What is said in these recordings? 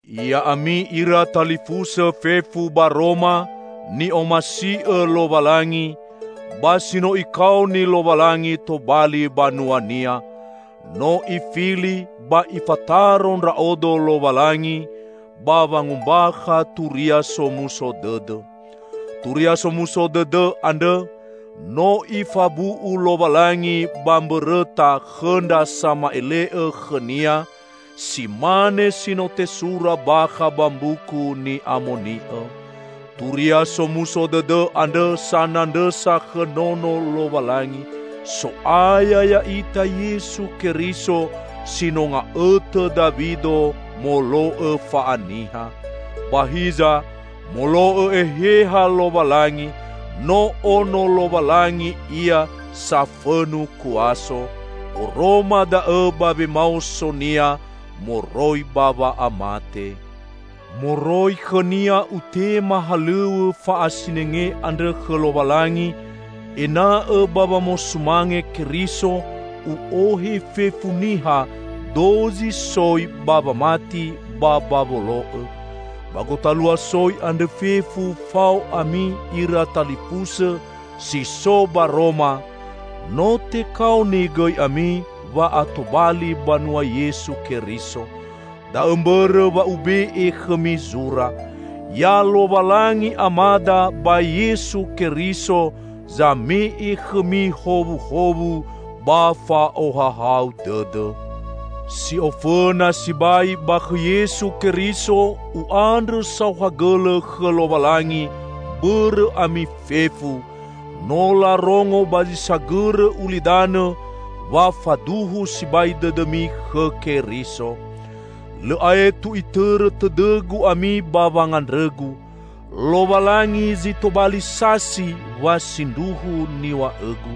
Ya'ami ira talifusõ fefu ba Roma, ni'omasi'õ Lowalangi, ba si no Ikaoni Lowalangi tobali banua-Nia. No Ifili ba Ifataro ndra'odo Lowalangi ba wangombakha Turia Somuso Dõdõ. Turia Somuso Dõdõ andrõ, no Ifabu'u Lowalangi ba mbõrõta khõ ndra sama'ele'õ khõ-Nia, si mane si no tesura bakha ba Mbuku Ni'amoni'õ. Turia Somuso Dõdõ andrõ sanandrõsa khõ Nono Lowalangi, So'aya ya'ita Yesu Keriso si no nga'õtõ Dawido molo'õ fa'aniha. Ba hiza, molo'õ Eheha Lowalangi, no Ono Lowalangi Ia safõnu kuaso. Oroma da'õ ba wemaoso-Nia moroi ba wa'amate. Moroi khõ-Nia utema halõw̃õ fa'asinenge andrõ khõ Lowalangi, ena'õ -- ba wamosumange Keriso -- u'ohe fefu niha dozi soi ba wamati ba ba wolo'õ. Ba gotalua soi andrõ fefu fao ami, ira talifusõ si so ba Roma; no tekaoni gõi ami wa'atobali banua Yesu Keriso. Da'õ mbõrõ wa ube'e khõmi zura. Ya Lowalangi Amada ba Yesu Keriso zame'e khõmi howuhowu ba fa'ohahau dõdõ. Si ofõna sibai ba khõ Yesu Keriso, u'andrõ saohagõlõ khõ Lowalangi bõrõ ami fefu; no larongo ba zi sagõrõ ulidanõ wa faduhu sibai dõdõmi khõ Keriso. Lõ aetu itõrõ tõdõgu ami ba wangandrõgu. Lowalangi zi tobali sasi wa sindruhu niw̃a'õgu.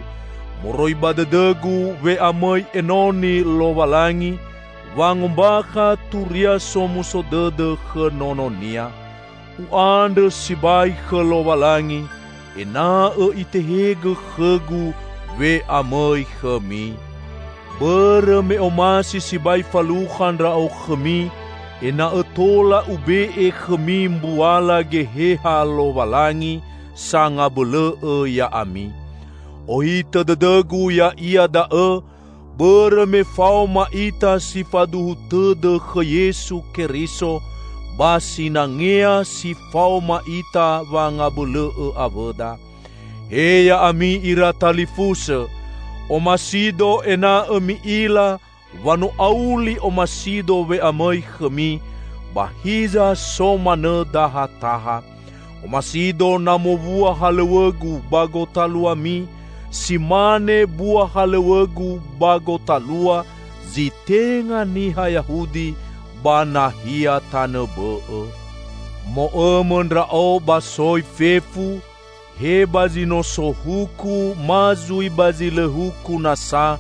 Moroi ba dõdõgu we'amõi enoni Lowalangi wangombakha Turia Somuso Dõdõ khõ Nono-Nia. U'andrõ sibai khõ Lowalangi ena'õ itehegõ khõgu we'amõi khõmi. Bõrõ me omasi sibai falukha ndra'o khõmi ena'õ tola ube'e khõmi mbuala Geheha Lowalangi sangabõlõ'õ ya'ami. Ohitõ dõdõgu ya'ia da'õ, bõrõ me faoma ita si faduhu tõdõ khõ Yesu Keriso, ba sinangea si faoma ita wangabõlõ'õ awõda. He ya'ami ira talifusõ! Omasido ena'õ mi'ila wa no auli omasido we'amõi khõmi, ba hiza so manõ dahataha. Omasido na mowua halõw̃õgu ba gotaluami si mane bua halõw̃õgu ba gotalua zi tenga niha Yahudi ba nahia tanõ bõ'õ. Mo'õmõ ndra'o ba soi fefu; he ba zi no so huku ma zui ba zi lõ huku nasa,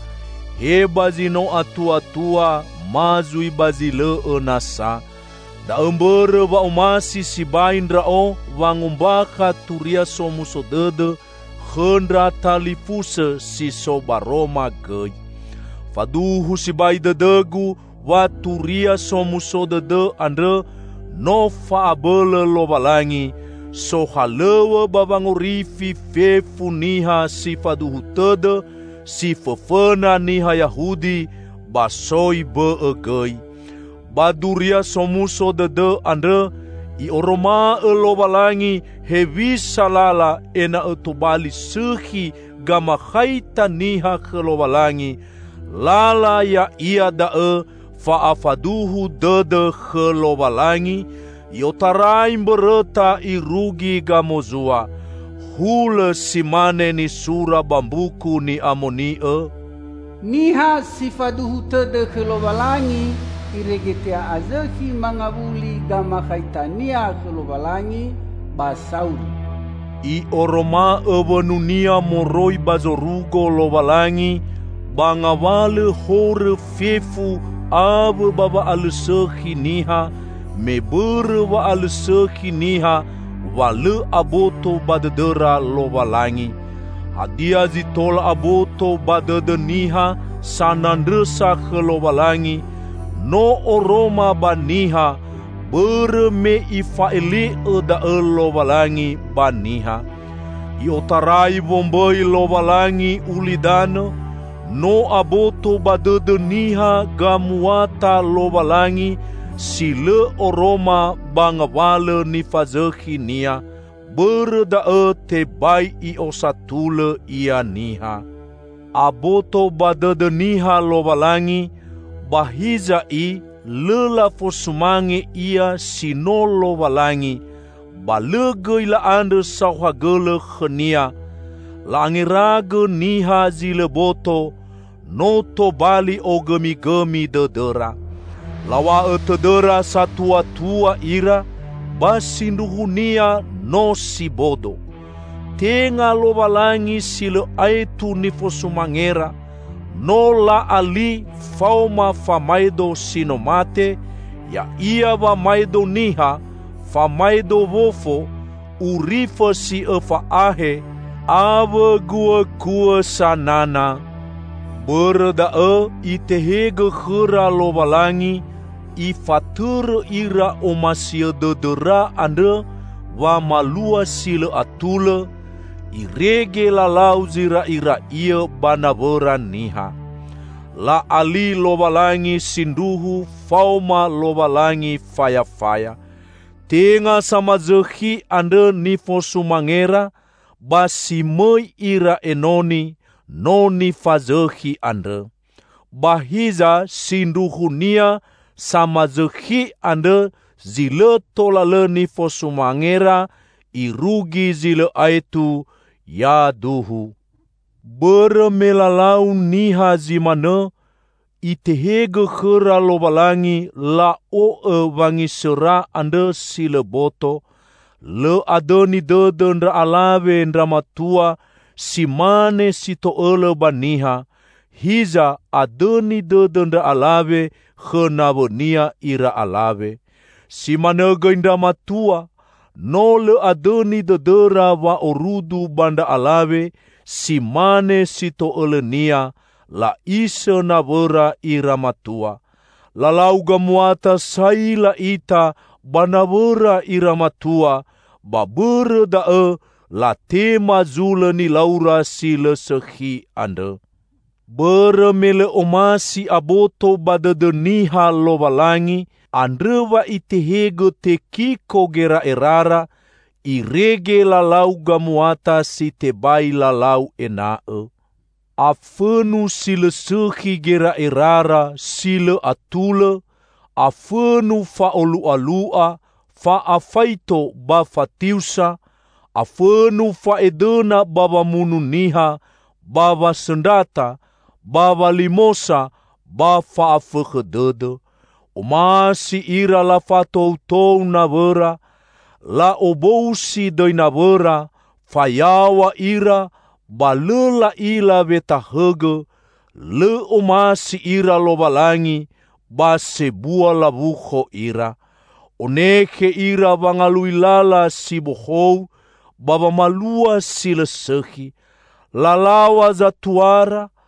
he ba zi no atuatua, ma zui ba zi lõ'õ nasa. Da'õ mbõrõ wa omasi sibai ndra'o wangombakha Turia Somuso Dõdõ khõ ndra talifusõ si so ba Roma gõi. Faduhu sibai dõdõgu wa Turia Somuso Dõdõ andrõ no fa'abõlõ Lowalangi, sohalõw̃õ ba wangorifi fefu niha si faduhu tõdõ; si fõfõna niha Yahudi, ba soi bõ'õ gõi. Ba Duria Somuso Dõdõ andrõ I'oroma'õ Lowalangi hewisa lala ena'õ tobali sõkhi gamakhaita niha khõ Lowalangi; lala ya'ia da'õ fa'afaduhu dõdõ khõ Lowalangi, i'otarai mbõrõta irugi gamozua. Hulõ si mane nisura ba Mbuku Ni'amoni'õ, "Niha si faduhu tõdõ khõ Lowalangi irege te'a'azõkhi mangawuli gamakhaitania khõ Lowalangi, ba sauri!" I'oroma'õ wõnu-Nia moroi ba zorugo Lowalangi ba ngawalõ horõ fefu awõ ba wa'alõsõkhi niha, me bõrõ wa'alõsõkhi niha wa lõ aboto ba dõdõra Lowalangi. Hadia zi tola aboto ba dõdõ niha sanandrõsa khõ Lowalangi, no oroma ba niha, bõrõ me ifa'ele'õ da'õ Lowalangi ba niha. I'otarai wombõi Lowalangi ulidanõ, no aboto ba dõdõ niha gamuata Lowalangi si lõ oroma ba ngawalõ nifazõkhi-Nia. Bõrõ da'õ tebai i'osatulõ ia niha. Aboto ba dõdõ niha Lowalangi, ba hiza i lõ lafosumange Ia si no Lowalangi, ba lõ gõi la'andrõ saohagõlõ khõ-Nia. La'angeragõ niha zi lõ boto; no tobali ogõmigõmi dõdõra. Law̃a'õ tõdõra satuatua ira, ba sindruhunia no si bodo. Tenga Lowalangi si lõ aetu nifosumangera, no la'ali faoma famaedo si no mate, ya'ia wamaedo niha, famaedo wofo, urifõ si õfa ahe, awõ guõkuõ sanana. Bõrõ da'õ Itehegõ khõra Lowalangi ifatõrõ ira omasiõ dõdõra andrõ wamalua si lõ atulõ, irege lalau zira'ira'iõ ba nawõra niha. La'ali Lowalangi sindruhu faoma Lowalangi fayafaya. Tenga samazõkhi andrõ nifosumangera ba si mõi ira enoni, no nifazõkhi andrõ. Ba hiza sindruhunia samazõkhi andrõ zi lõ tola lõ nifosumangera irugi zi lõ aetu! Yaduhu. Bõrõ me lalau niha zi manõ, Itehegõ khõra Lowalangi la'o'õ wangisõra andrõ si lõ boto. Lõ adõni dõdõ ndra alawe ndra matua, si mane si to'õlõ ba niha, hiza adõni dõdõ ndra alawe khõ nawõnia ira alawe. Si manõ gõi ndra matua; no lõ adõni dõdõra wa'orudu ba ndra alawe si mane si to'õlõnia, la'isõ nawõra ira matua. Lalau gamuata saila ita ba nawõra ira matua, ba bõrõ da'õ latema zulõ nilaura si lõ sõkhi andrõ. Bõrõ me lõ omasi aboto ba dõdõ niha Lowalangi, andrõ wa Itehegõ tekiko gera'erara, irege lalau gamuata si tebai lalau ena'õ. Afõnu si lõ sõkhi gera'erara, si lõ atulõ; afõnu fa'olu'alu'a, fa'afaito ba fatiusa; afõnu fa'edõna ba wamunu niha, ba wasõndrata, ba walimosa ba fa'afõkhõ dõdõ. Omasi ira lafatoutou nawõra, La'obousi dõi nawõra; fayaw̃a ira ba lõ la'ila wetahõgõ, lõ omasi ira Lowalangi ba sebua lawukho ira. Onekhe ira wangalui lala si bohou ba wamalua si lõ sõkhi. Lalaw̃a zatuara;